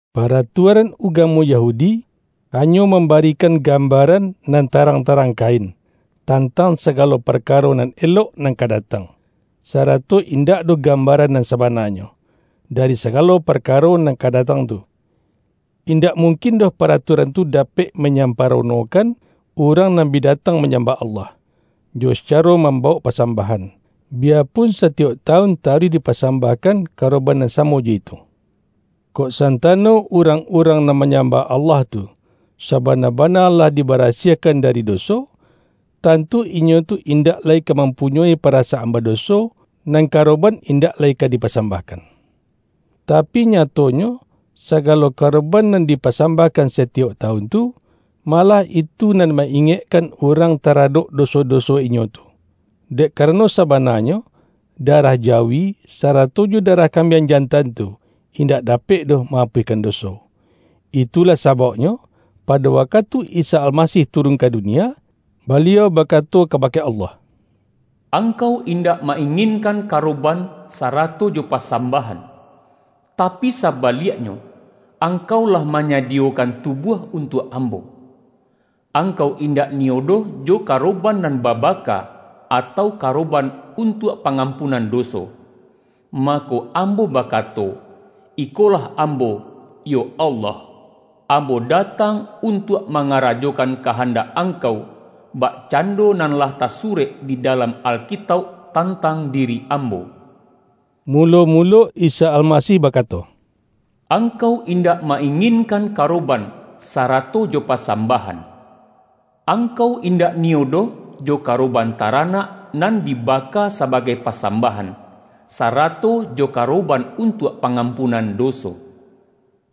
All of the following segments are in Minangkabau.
Paratuaran ugamo Yahudi, hanyo mambarikan gambaran nan tarang-tarang kain, tantang saga-lo parkaro nan elok nan ka datang, sa-rato indak doh gambaran nan sabana-nyo, dari sagalo parkaro nan ka datang tu. Indak mungkin doh paratuaran tu dapek manyamparonokan, urang nan bi datang manyambah Allah, jo saca-ro mambawok pasambahan, biyapun satiyok tawun taruih dipasambahkan karoban nan samo jo itu. Kok san-tano urang-urang nan manyambah Allah tu, sabana-bana lah dibarasiah-kan dari doso, tantu inyo tu indak lai ka mampunyoi parasaan badoso, nan karoban indak lai ka dipasambahkan. Tapi nyatonyo, sagalo karoban nan dipasambahkan satiyok tawun tu, ma-lah itu nan ma-ingekkan urang tara-dok doso-doso inyo tu, dek karano sabananyo, darah jawi, sarato jo da-rah kambiang jantan tu, indak dapek doh ma-apuihkan doso. Itulah sabauknyo, pado wakatu Isa Almasih turun ka dunia, Baliau baka-to kabake Allah,”Angkau indak ma-inginkan karoban sarato jo pasambahan; tapi sabaliaknyo, Angkau lah manyadiyokan tubuah untuak Ambo. Angkau indak niyo doh jo karoban nan babaka, atau karoban untuak pangampunan doso. Mako Ambo bakato, ’Ikolah Ambo, yo Allah! Ambo datang untuak mangarajokan kahandak Angkau, bakcando nan lah tasurek di dalam Alkitauk, tantang diri Ambo.’” Mulo-mulo Isa Almasih bakato,”Angkau indak ma- inginkan karo-ban, sarato jo pasambahan; Angkau indak niyo doh jo karoban taranak, nan dibaka sabagai pasambahan, sa-rato jo karoban untuak pangampunan doso.”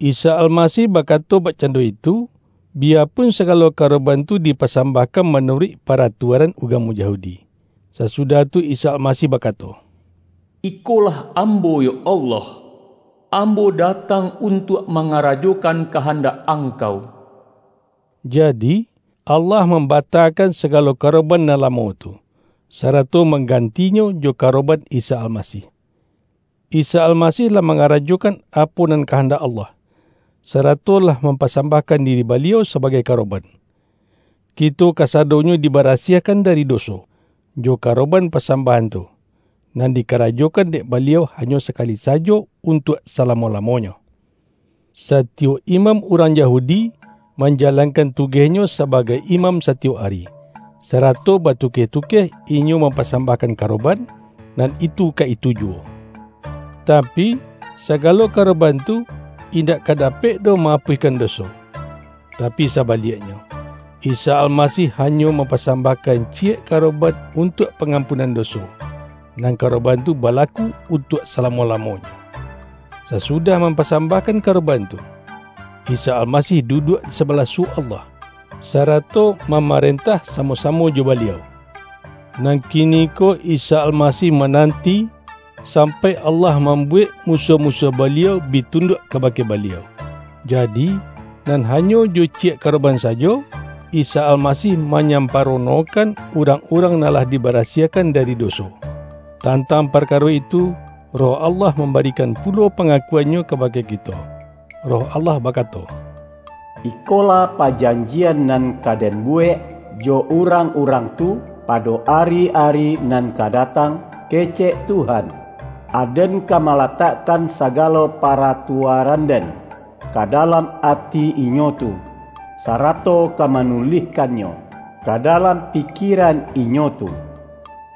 Isa Almasih bakato bakcando itu, biyapun sagalo karoban tu di-pasambahkan manuruik paratuaran ugamo Yahudi. Sasudah tu Isa Alma-sih bakato,”Ikolah Ambo, yo Allah! Ambo datang untuak mangarajokan kahandak Angkau.” Jadi, Allah mam-batakan sagalo karoban nan lamo tu, sarato manggantinyo jo karoban Isa Almasih. Isa Almasih lah manga-rajokan apo nan kahandak Allah, sarato lah mampasambahkan diri Ba-liau sabagai karoban. Kito kasadonyo dibarasiahkan dari doso, jo karoban pasambahan tu, nan dikarajokan dek Baliau hanyo sakali sajo untuak sala-mo-lamonyo. Satiyok imam urang Yahudi, manjalankan tugehnyo sabagai imam satiyok ari, sarato batukeh-tukeh inyo mampasambahkan karoban, nan itu ka itu juwo. Tapi, sagalo karoban tu, indak ka dapek doh ma-apuihkan do-so. Tapi sabaliaknyo, Isa Almasih hanyo mampasambahkan ciyek karo-ban, untuak pangampunan doso, nan karoban tu balaku untuak salamo-la-monyo. Sasudah mampasambahkan karoban tu, Isa Almasih duduak di sabalah suwok Allah, sarato mama-rentah samo-samo jo Baliau. Nan kiniko Isa Almasih mananti, sampai Allah mambuwek musuah-musuah Baliau bi tunduak kabake Baliau. Jadi, nan hanyo jo ciyek karoban sajo, Isa Almasih manyamparonokan urang-urang nan lah dibarasiahkan dari doso. Tantang parkaro itu, Roh Allah mambarikan pulo pangakuan-Nyo ka-bake kito. Roh Allah bakato, ”’Ikolah pajanjian nan ka Den buwek jo urang-urang tu, pado ari-ari nan ka datang,’ kecek Tuhan, ’Aden ka malatakkan sagalo paratuaran-Den ka dalam ati inyo tu, sarato ka manulihkannyo ka dalam pikieran inyo tu.’”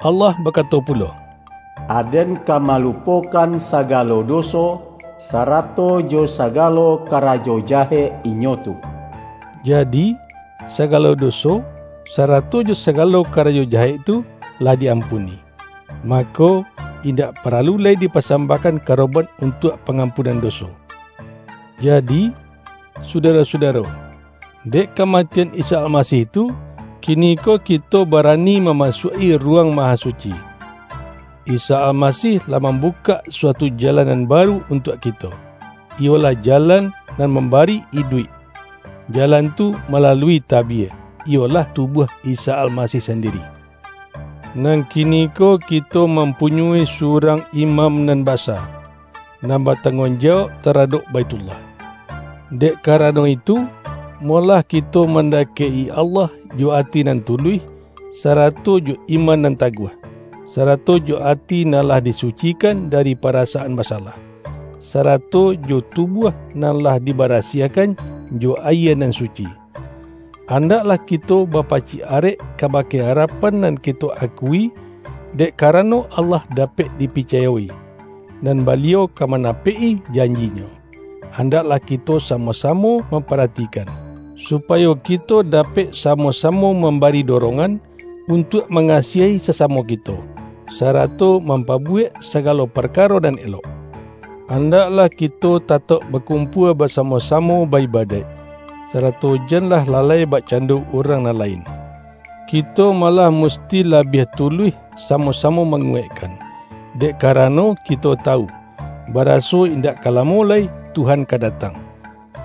Allah bakato pulo,”Aden ka malu-pokan sagalo doso, sarato jo sagalo karajo jahek inyo tu.” Jadi, sagalo doso, sarato jo sagalo karajo jahek tu, lah di ampuni, mako, indak paralu lai dipasambahkan karoban untuak pa-ngampunan doso. Jadi, sudaro-sudaro, dek kama-tian Isa Almasih tu, kiniko kito ba-rani mamasuak-i Ruwang Mahasuci. Isa Almasih lah mambukak suatu jalan nan baru untuak kito, iyolah ja-lan nan mambari iduik. Jalan tu ma-lalui tabie, iyolah tubuah Isa Almasih sandiri. Nan kiniko kito mampu-nyoi surang Imam Nan Basa, nan batangguang jawauk taradok Baithullah. Dek karano itu, molah kito manda-kek-i Allah jo ati nan tuluih, sarato jo iman nan taguah; sarato jo ati nan lah disucikan dari parasaan basalah, sara-to jo tubuah nan lah dibarasiahkan jo ayie nan suci. Andaklah kito bapacik arek kabake arapan nan kito akui, dek karano Allah dapek dipicayo-i, nan Ba-liau ka manapek-i janji-Nyo. Andak-lah kito samo-samo mamparatikan, su-payo kito dapek samo-samo mambari dorongan, untuak mangasiahi sasamo kito, sarato mampabuwek sagalo par-karo nan elok. Andaklah kito tatauk bakumpua basamo-samo ba-ibadaik, sarato janlah lalai bakcando urang nan lain. Kito malah musti labiah tuluih sa-mo-samo manguwaikkan, dek karano kito tawu, baraso indak ka lamo lai Tuhan ka datang.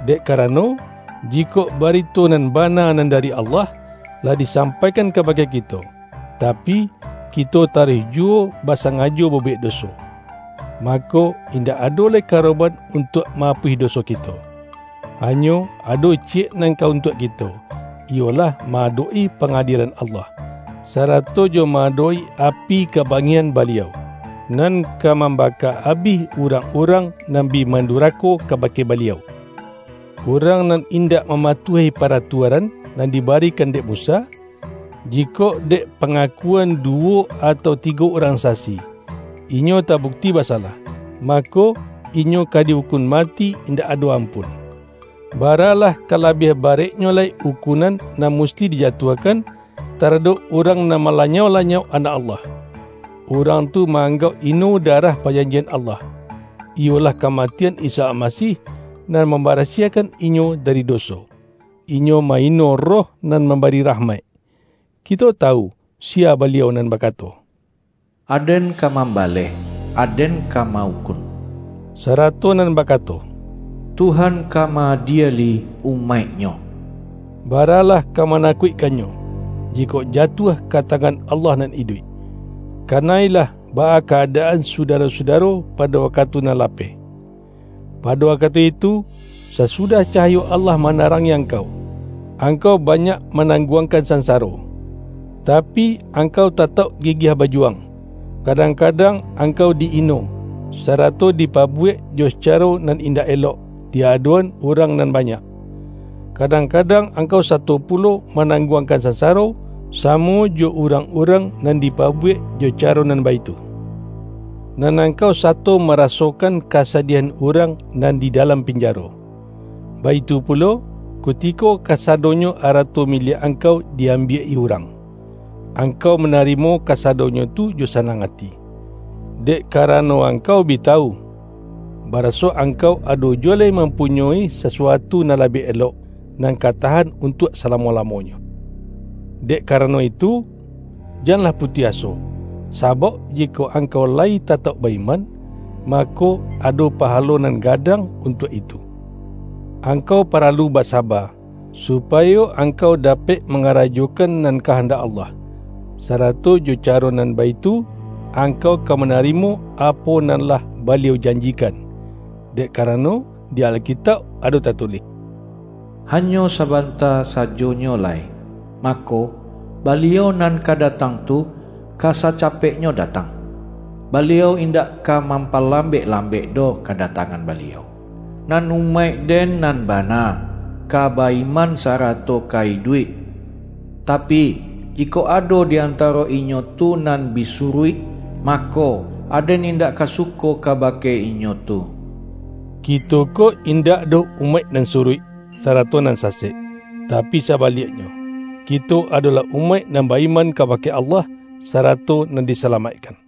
Dek karano, jikok barito nan ba-na nan dari Allah, lah disampaikan ka-bake kito, tapi, kito taruih juwo basa-ngajo babuwek doso, mako, indak ado lai karoban untuak ma-apuih doso ki-to. Hanyo ado ciyek nan ka untuak kito, iyolah ma-adok-i pangadielan Allah, sarato jo ma-adok-i api kaba-ngihan Baliau, nan ka mambaka abih urang-urang nan bi mandurako kaba-ke Baliau! Urang nan indak mama-tuahi paratuaran nan dibarikan dek Musa, jikok dek pangakuan duwo atau tigo urang sasi, inyo tabukti basalah, mako, inyo ka di-ukun mati indak ado ampun. Baralah ka labiah bareknyo lai ukunan nan musti dijatuahkan, tara-dok urang nan malanyau-lanyau Anak Allah. Urang tu ma-anggauk ino darah pajanjian Allah, iyolah kamatian Isa Almasih, nan mambarasiahkan inyo da-ri doso. Inyo ma-ino Roh nan mambari rahmaik. Kito tawu, siya Baliau nan bakato,”Aden ka mambaleh! Aden ka ma-ukun!” sarato nan bakato,”Tuhan ka ma-adieli umaik-Nyo.” Baralah ka manakuikkannyo, jikok jatuah ka tangan Allah Nan Iduik! Kana-ilah baa ka-adaan sudaro-sudaro pado wakatu nan lapeh. Pado wakatu itu, sasudah cahayo Allah ma-narangi angkau, angkau banyak ma-nangguangkan sansaro; tapi, angkau tatauk gigiah bajuwang. Kadang-kadang angkau di-ino, sarato dipabu-wek jo sacaro nan indak elok di adok-an urang nan banyak. Kadang-kadang angkau sato pulo manangguangkan sansaro, samo jo urang-urang nan di-pabuwek jo caro nan baitu, nan ang-kau sato marasokan kasadiahan urang nan di dalam pinjaro. Baitu pulo, kuti-ko kasadonyo arato miliak angkau di-ambiak-i urang, angkau manarimo ka-sadonyo tu jo sanang ati, dek karano angkau bi tawu, baraso angkau ado ju-wo lai mampunyoi sasuatu nan labiah elok, nan ka tahan untuak salamo-la-monyo. Dek karano itu, janlah pu-tuih aso, sabauk jikok angkau layi ta-tauk ba-iman, mako, ado pahalo nan gadang untuak itu! Angkau paralu basaba, supayo angkau dapek manga-rajokan nan kahandak Allah, sarato jo caro nan baitu, angkau ka manarimo apo nan lah Baliau janjikan. Dek ka-rano di Alkitauk ado tatulih,”Hanyo sabanta sajonyo lai, mako, Baliau nan ka datang tu, ka sacapeknyo datang; Baliau indak ka mampalambek-lambek doh kadatangan Baliau. Nan umaik-Den nan bana, ka ba-iman sarato ka iduik; tapi, jikok ado di antaro inyo tu nan bi suruik, mako, Aden indak ka suko kabake inyo tu.” Kito ko indak doh umaik nan suruik, sarato nan sasek. Tapi sabaliaknyo, ki-to adolah umaik nan ba-iman kabake Allah, sarato nan disalamaikkan.